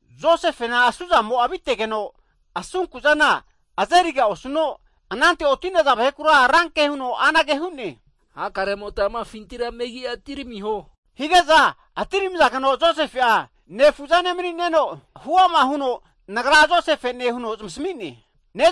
Josefena, asuzamo avitegeno, anante oti'naza vahe ranke huno hakare amota amafintira megi'a atiramiho, higeza atiramizageno, Josefe'a nefuzane mani'neno huama huno, nagra Josefene huno zamasi'ne.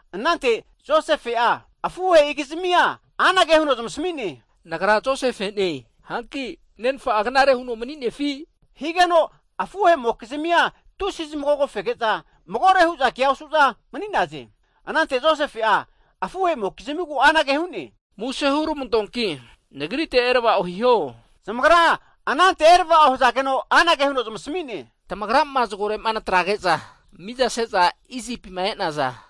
Anante Josefe afuhei'gizmi anage huno zamasmi'ne, nagra Josefe'ne! Nenfa'a knare huno maninefi? Higeno, afuhe'mokizmia, tusi'a zamagogo fege'za magore hu'za kea osu'za mani'naze. Anante Josefe afuhei'gizmigu anage hu'ne, Muse (plis) hurmantoanki nagrite erava'o hiho. Zamagra anante erava'o hzageno. Agra anage hu'ne. Nagra, tamagri nermafune Josefena, tamagrama zgorema natrage'za mizase'za Isipima e'nazane.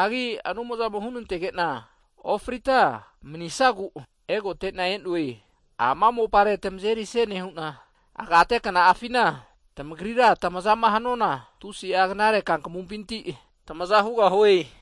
Anumzamo hunantegena ofrita manisagu egotena e'noe, ama mopare tmazeri'se nehu'na, agate kna'afina tmagri'ra tmazama hanuana tusi'a knare kankamupinti tmaza hugahue.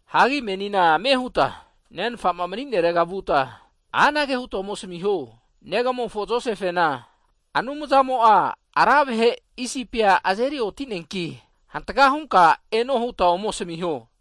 Ame huta nenfa hirega vuta, anage huta ome asmiho, negamofo Josefena, Anumzamo ra vahe Isipi nazeri oti'neanki, avega ontenka ko hantka hunka eno, huta ome asmiho.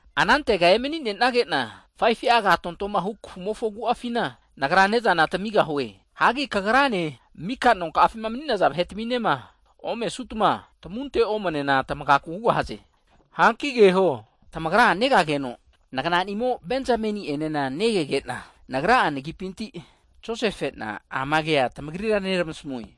Anantega mani'nenagena nagra ne'zana tamigahue, 5fu'a agate kafumofo agu'afina, kagrane, mika nonka'afima maninaza vahe'tminema omesutma tamunte omnena frigahaze. Keho, tamagra negageno, nagna'nimo Benjameni enena nege, nagra nagipinti ama kea tamagrira nermasmue.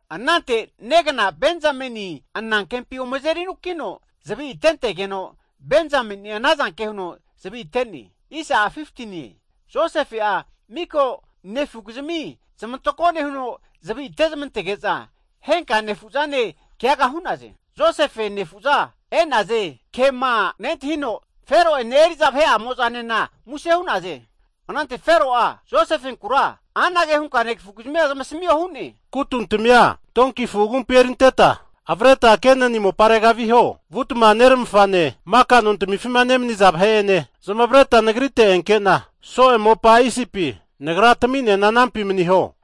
Anante negna Benjameni anankempi ome azeri anukino zvi atente'geno, Benjameni'a ana zanke huno zavi ate'ne. Josefe'a mika'nefugizmi zamantako nehuno zavi atezamantetege'za, henka nefu'zane keaga hu'naze. Josefe nefu'za e'naze ke nentahino, Fero ene eri'za vahe anena muse hu'naze. Anante Fero'a Josefenkura anage hunka negfu'gizmia zamasmio hu'ne, amana hiho, kutuntamia donki afu agumpi erintetma avreta Kenani moparega viho, vutma nermafane maka nontmifi nemniza vahe ene zamareta nagrite enke'na, soe mopa Isipi nagra taminena anampi maniho.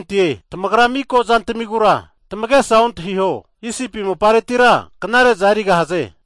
Tmagra miko zantamigura tamagesa ontahiho, Isipi mopareti knare'za erigahaze.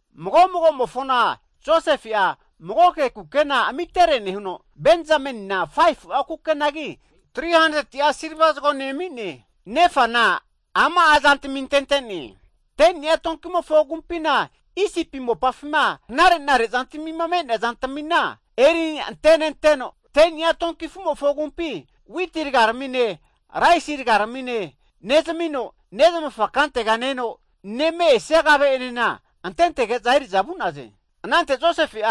Mago mago'mofona Josefe'a magoke kukena zamitere nehuno, Benjamenina 5fu'a kukenagi, 300ti'a silva zgone ami'ne. Nefana ama zama'a antente'ne, 10ni'a donkimofo agumpi knareza Isipi me'neaza eri nenteno, 10ni'a donkimofo agumpi witi rgane, raisi rgane (grain) nezmino, nezmafa kantega ne-eno neme esia kave antege'za eri'za vu'naze. Anante Josefe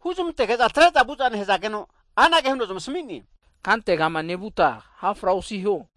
huzmantege'za atre'za vuza nehzageno, anage huno zamsmi'ne, kantega nevuta ha' fra osiho.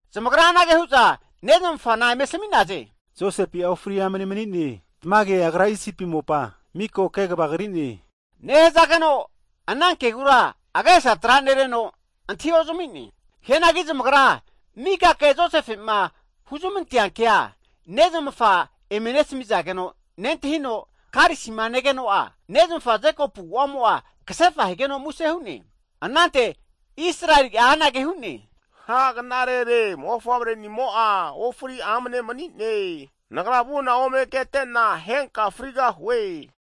Zamagra anage hu'za nezmafa asmi'naze, Josefe'a ofri amne mani'ne, tmage agra Isipi mopa miko kegva kri'ne, nehzageno ana kegura agesa tra'nereno antahi ozami'ne. Hianagi zamagra mika ke Josefe huzmantenea ke, nezmafa eme nesmizageno nentahino, arenteno avazu huno vu'za negeno, nezmafa Jekopu agu'amo ksefa higeno muse hu'ne. Anante Israeli anage hu'ne, ha knarere, mofavrenimo'a ofri amne mani'ne. Nagra vu'na ome kete'na henka frigahue.